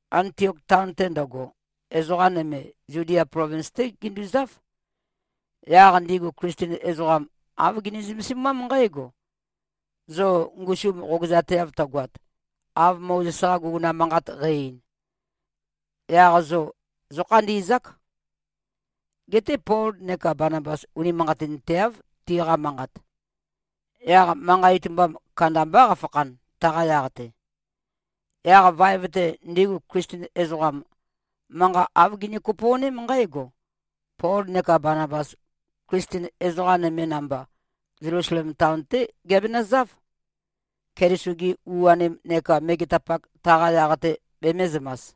Antiok taon-te ndøgo, ezoqa nøme Zudia plovins-té ginduzáv. Yaq ndigu Klisten ezoqam, āv gini-zømesimám nqǽgo, “Zo ngusum qogøzateav tøgoat, av Mozes-qa guguna manqat qæ-ein, yaq zo zókhandi꞉zák.” Geté Pol neka Banabas unimanqatinteáv, tiqa manqat. Yaq manqa itumbam kandambá qafakhan, taqa yaq-te. Yaq vaev-te, ndigu Klisten ezoqam, manqa āv gini-kopo꞉ném nqǽgo: Pol neka Banabas, Klisten ezoqa nøme namba, Zelusalem taon-té giabenøzáv, Keliso-gi u-anim neka megetapak taqa yaq-te bemēzømas.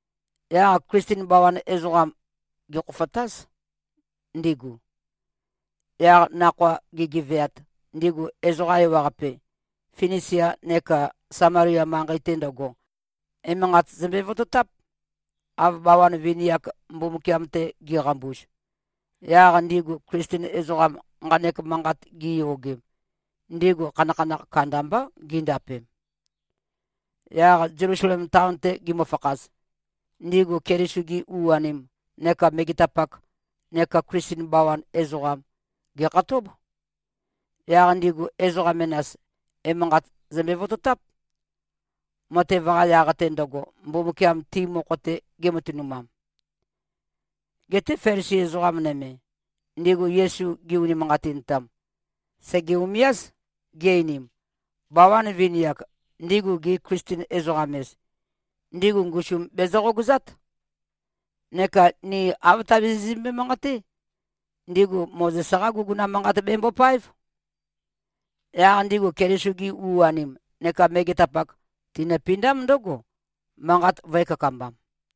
Yaq Klisten bawan ezoqam, gèkhofotáz, ndigu. Yaq nakhoa gigeveat, ndigu ezoqa ewaqape, Finisia neka Samalia manqei-te ndøgo, emanqat zømbe-vototáp, av bawan vini-ak Mbumbukiam-te giqambuz. Yaq ndigu Klisten ezoqam, nqanek manqat giyogem, ndigu khanakhanakh kandambá gindapem. Yaq Zelusalem taon-te gimøfakhaz, ndigu Keliso-gi u-anim neka megetapak neka Klisten bawan ezoqam, gèkhatób. Yaq ndigu ezoqa menas, emanqat zømbe-vototáp, matev-qa yaq-te ndøgo, Mbumbukiam ti mokho-te gematønumam. Geté Felisi ezoqa nøme, ndigu Yesu gi-unimanqatintam, sège-umiáz, gi-einim, “Bawan vini-ak, ndigu gi-Klisten-ezoqam-ez, ndigu ngusum bezø-qogøzát. Neka ni āv tabizizømbe-manqaté. Ndigu Mozes-qá guguna manqat bembopáev.” Yaq ndigu Keliso-gi u-anim neka megetapak tinøpindám ndǿgo, manqat vø̄e-kakambam.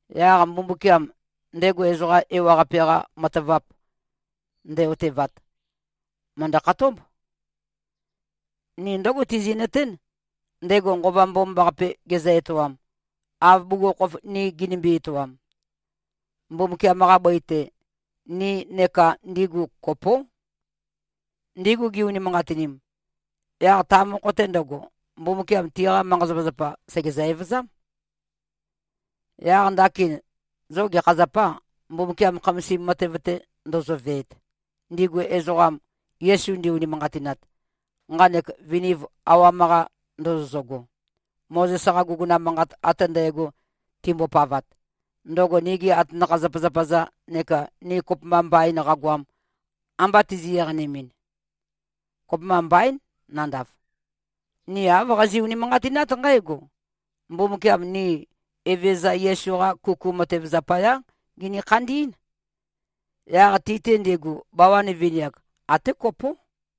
Yaq Mbumbukiam, ndego ezoqa ewaqape-qa matavap nde-otevat, mø̀ndø-khatób. Ni ndǿgo tizi꞉nøtén, ndego Nqova Mbomambaqape gezø-etoam, av bugukhokhof ni ginimbi-etoam. Mbumbukiam-qa bøi-te, ni neka ndigu kopó. Ndigu gi-unimanqatinim, yaq ta mokho-te ndøgo, Mbumbukiam tiqa manqa-zapazapa sègezø-evøzám. Yaq ndakin, zo gekha zapâ, Mbumbukiam khamasim matev-te ndozoveet, ndigu ezoqam, Yesu ndi-unimanqatinat, nqanek viniv awam-qa ndozozøgo, Mozes-qa guguna manqat ate ndægo timbopavat, ndøgo nigi atanakha-zapazapa-za neka ni kopømba mbain qagoam, amba tizi-eqanemɨn? Kopømba mbaín, nandav! Ni āv qazi꞉-unimanqatinát nqǽgo: Mbumbukiam ni Evezøza Yesu-qa kuku matev zapayá gini-khandí꞉n. Yaq ti-te ndigu, bawan vini-ak, até kopó.”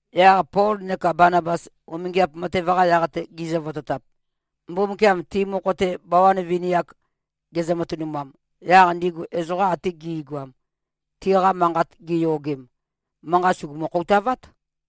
Yaq Pol neka Banabas, umingiap matev-qa yaq-te gi꞉zøvototap, Mbumbukiam ti mokho-te bawan vini-ak gezø-matønumat, yaq ndigu ezoqa ate gi꞉goam, tiqa manqat giyogem, manqa sùgumu-khoutavát.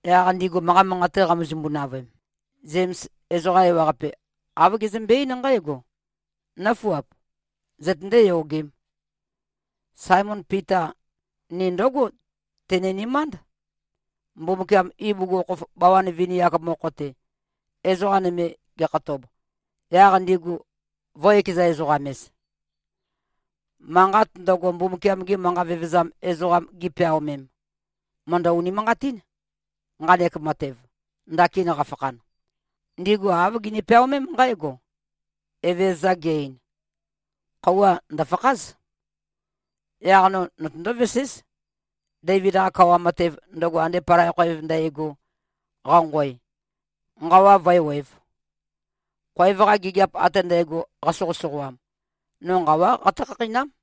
Yaq ndigu manqa manqate qamøzømbu-navøem, Zems ezoqa ewaqape, āv gezømbe-eín nqǽgo, “Nǿfuap! Zøtøndé-yogēm. Saemon Pita ni ndǿgo teni꞉nømánd, Mbumbukiam ibugukhokhof bawan vini-ak mokho-te, ezoqa nøme gekhatob, yaq ndigu vø̄-ekeza-ezoqam-ez. Manqat ndøgo, Mbumbukiam-gi manqa vevezam ezoqam gipeaomem, mø̀ndø-unimanqatín, nqanek matev, ndakin qafakhan. Ndigu āv gini-peaomém nqǽgo, ‘Evezøza ge-ein, “Khøuwa ndø̀fakház. Yaq no notøndó-veséz, Deivid-qa kawa matev, ndøgo ande palai khoev ndægo, qanqoe, nqawa vǿewēv. Khoev-qa gigiap ate ndægo qasoqøsoqoam, no nqawá qatǿ-khakheinám.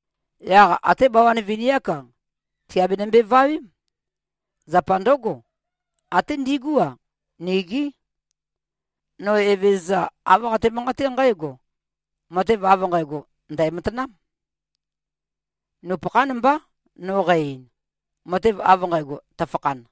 Yaq até bawan vini-ák-a, tìabenømbe-vawém. Zapa ndǿgo, até ndigú-a, nigí. No, Evezøza, āv qate-manqaté nqǽgo: Matev av nqægo ndæ̀matanám. Nupøkhán mbá no qæ-ein, matev av nqægo tøfakhan.”’”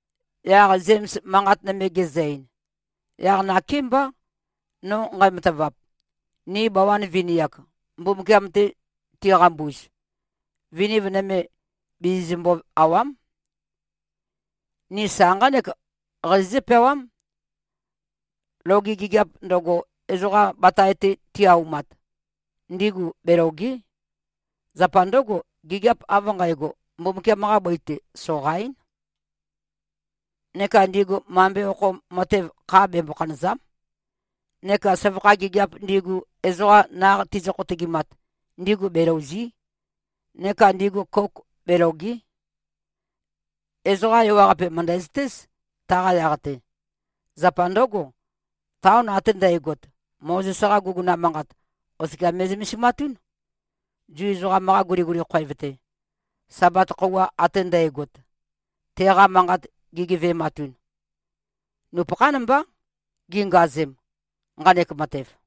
Yaq Zems manqat nøme gezø-ein, “Yaq nakémbá, no nqæmatavap, ni bawan vini-ak, Mbumbukiam-te tiqambuz, viniv nøme bizizømbø-àwa᷄m. Ni sa nqánek qazizǿ-peawam, ‘Loge gigiap ndøgo, ezoqa batae-te ti-aumat, ndigu belòge᷄. Zapa ndǿgo, gigiap av nqægo, Mbumbukiam-qa bøi-te soqaín. Neka ndigu mambe okho matev, kha bembo-khanø̀za᷄m. Neka søvakha gigiap ndigu, ezoqa naq tizø-khotøgimat, ndigu belòuzi᷄. Neka ndigu kouk belòge᷄.’ Ezoqa ewaqape mø̀ndæzøtéz, taqa yaq-te. Zapa ndǿgo, taon ate ndægot, Mozes-qa guguna manqat oskia me꞉zømesimatún, Zu ezoqam-qa guliguli khoev-te, Sabat khøuwa ate ndægot, teqa manqat gigeve꞉matun. Nupøkhán mbá gingazem, nqanek matev.”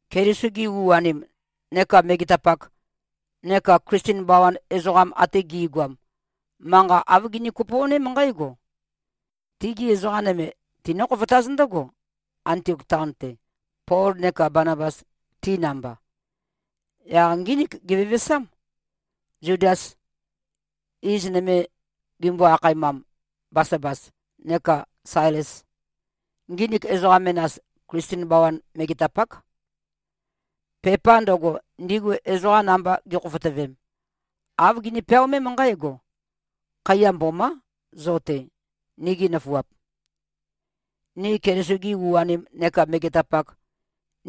Keliso-gi u-anim neka megetapak neka Klisten bawan ezoqam ate gi꞉goam, manqa āv gini-kopo꞉ném nqǽgo: Tigi ezoqa nøme tinǿ-khofotáz ndǿgo, Antiok taon-te, Pol neka Banabas, ti namba. Yaq ngínik givevesám. Zudás, iz nøme gimbo-akhaemam, Basabās, nekā Sailes. Nginik ezoqa menas, Klisten bawan megetapák. Pepa ndøgo, ndigu ezoqam namba gi꞉khofotøvem, āv gini-peaomém nqǽgo: “Khaiya mbomá, zo-te, nigi nøfuap. Ni Keliso-gi u-anim neka megetapak,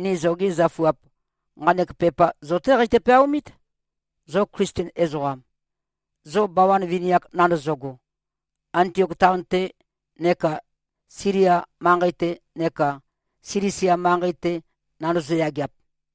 ni zogi zøfuap, nqanek pepa zo-té qeitø-peaomít, zo Klisten ezoqam, zo bawan vini-ak nandozogo, Antiok taon-te neka Silia manqei-te neka Silisia manqei-te nandozo-yageap.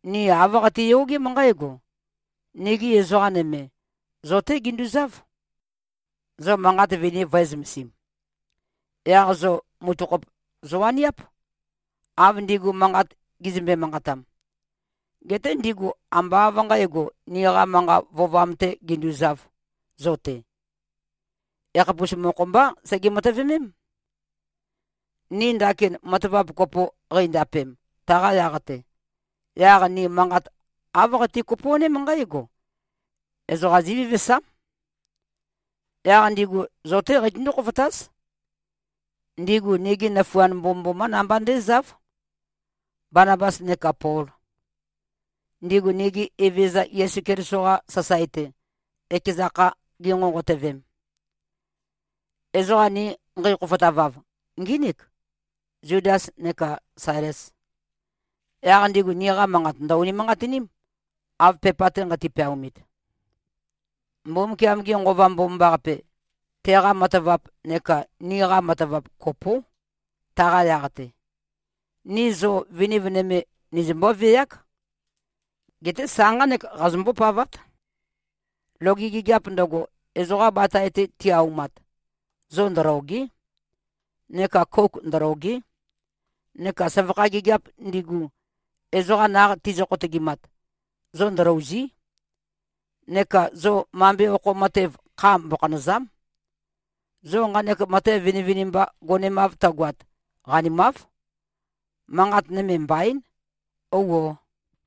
Ni āv qatiyogém nqǽgo: Nigi ezoqa nøme, zo-té ginduzáv, zo manqat vini vø̄e-zømesim. Yaq zo mutøkhop zowaniáp, av ndigu manqat gizømbe-manqatam. Geté ndigu ambá av nqǣgo, niqa manqa vøovam-tē ginduzāv zo-te. Ekhapus mokho-mbá sege-matøvemém. Ni ndakin matavap kopo qeindapem, taqa yaq-te, yaq ni manqat āv qati-kopo꞉ném nqǽgo: Ezoqa zívevesám. Yaq ndigu zo-té qeitøndú-khofotáz. Ndigu nigi nøfuand mbomømbomá namba ndézáv, Banabas neka Pol, ndigu nigi Evezøza Yesu Keliso-qa sasae-te, ekeza kha ginqonqotøvem. Ezoqa ni nqeikhofotavav, ngínik, Zudas neka Sailes. Yaq ndigu niqa manqat ndø̀-unimanqatiním, av pepa-te nqati-peaomit. Mbumbukiam-ge Nqova Mbomambaqape, teqa matavap, neka niqa matavap, kopó, taqa yaq-te. Ni zo viniv nøme nizømbó-veák. Geté sa nqánek qazombó-pavát: Loge gigiap ndøgo, ezoqa batae-te ti-aumat, zo ndølòge᷄. Neka kouk ndølòge᷄. Neka søvakha gigiap ndigu, ezoqa naq tizø-khotøgimat, zo ndølòuzi᷄. Neka zo mambe okho matev, kha mbokhanø̀za᷄m. Zo nqanek matev vinivinimba gonemav tøgoat, qanimáv. Manqat nøme mbaín. Ouo!”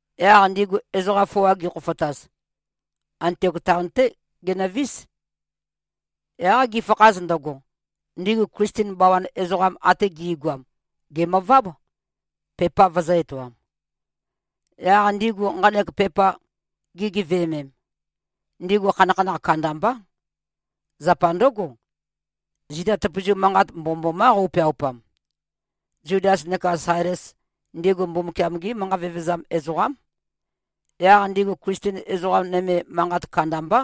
Yaq ndigu ezoqa foa gikhofotaz, Antiok taon-té ginøvís. Yaq gifakhaz ndøgo, ndigu Klisten bawan ezoqam ate gi꞉goam gèmøváb, pepa vøzø̄-etoam. Yaq ndigu nqanek pepa gigeveømem, ndigu khanakhanakh kandambá. Zapa ndǿgo, zita tøpøzu manqat mbomømbomá qøupeaupam. Zudas neka Sailes, ndigu Mbumbukiam-gí manqa vevezam ezoqám. Yaq ndigu Klisten ezoqa nøme manqat kandambá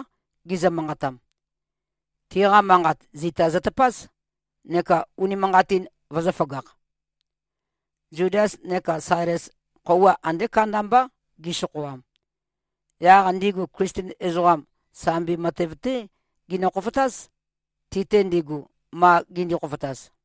gizø-manqatam. Tiqa manqat zita zøtøpáz, neka unimanqatin vøzø̄føgakh. Zudas neka Sailes, khøuwa andé kandambá gisokhoam. Yaq ndigu Klisten ezoqam, sambi matev-té ginø-khofotáz, ti-te ndigu, ma gindi-khofotaz.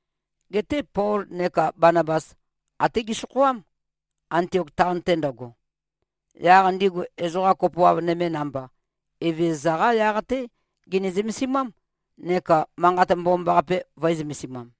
Geté Pol neka Banabas, até gesokhoám, Antiok taon-te ndøgo. Yaq ndigu, ezoqa kopoav nøme namba, Evezøza-qá yaq-té gini-zømesimám neka Manqat Mbomambaqape vø̄e-zømesimam.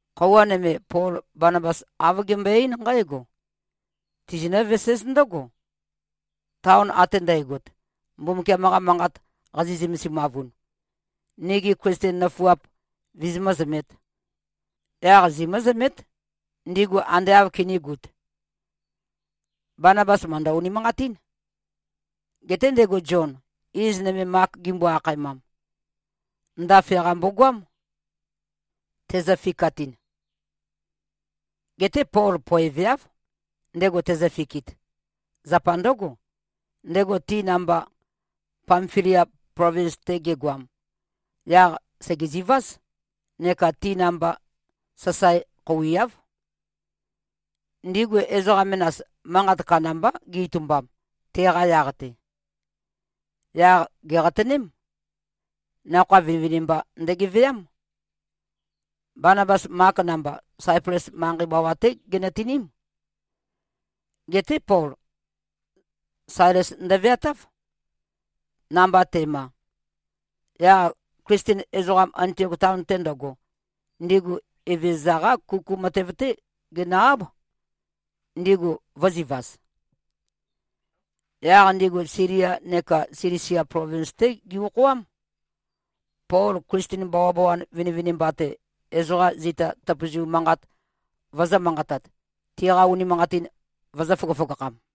Khøuwa nøme, Pol Banabas āv gembøe-eín nqǽgo, “Tizinǿ-veséz ndǿgo, taon ate ndægot, Mbumbukiam-qa Manqat qazi꞉-zømesimavun, nigi Klisten nøfuap vizimǿ-zømēt. Yaq zimǿ-zømét, ndigu ande āv kinīgut.” Banabas mø̀ndø-unimanqatín. Geté ndego Zion, iz nøme Mak gimbo-akhaemam, ndafe-qa mbogoam, tezø-fikatɨn. Geté Pol poeveáv, ndego tezøfikit. Zapa ndǿgo, ndego ti namba Pamfilia plovins-te gegoam, yaq sègeziváz, neka ti namba sasae khouiáv. Ndigu ezoqa menas, manqat kandambá gi-itumbam, teqa yaq-te. Yaq gèqatøném. Nakhoa vinivinimba ndøgeveám. Banabas, Mak namba, Saiples manqei bawa-té ginøtiním. Geté Pol, Sailes ndøveatáv, namba te꞉ma. Yaq Klisten ezoqam, Antiok taon-te ndøgo, ndigu Evezøza-qá kuku matev-té ginø-áb, ndigu vø̄zivaz. Yaq ndigu Silia neka Silisia plovins-té gi-okhoám, Pol Klisten bawabawan vinivinimba-te, ezoqa zita tøpøzu manqat vøzø̄-manqatat, tiqa unimanqatin vøzø̄-føgøføgakham.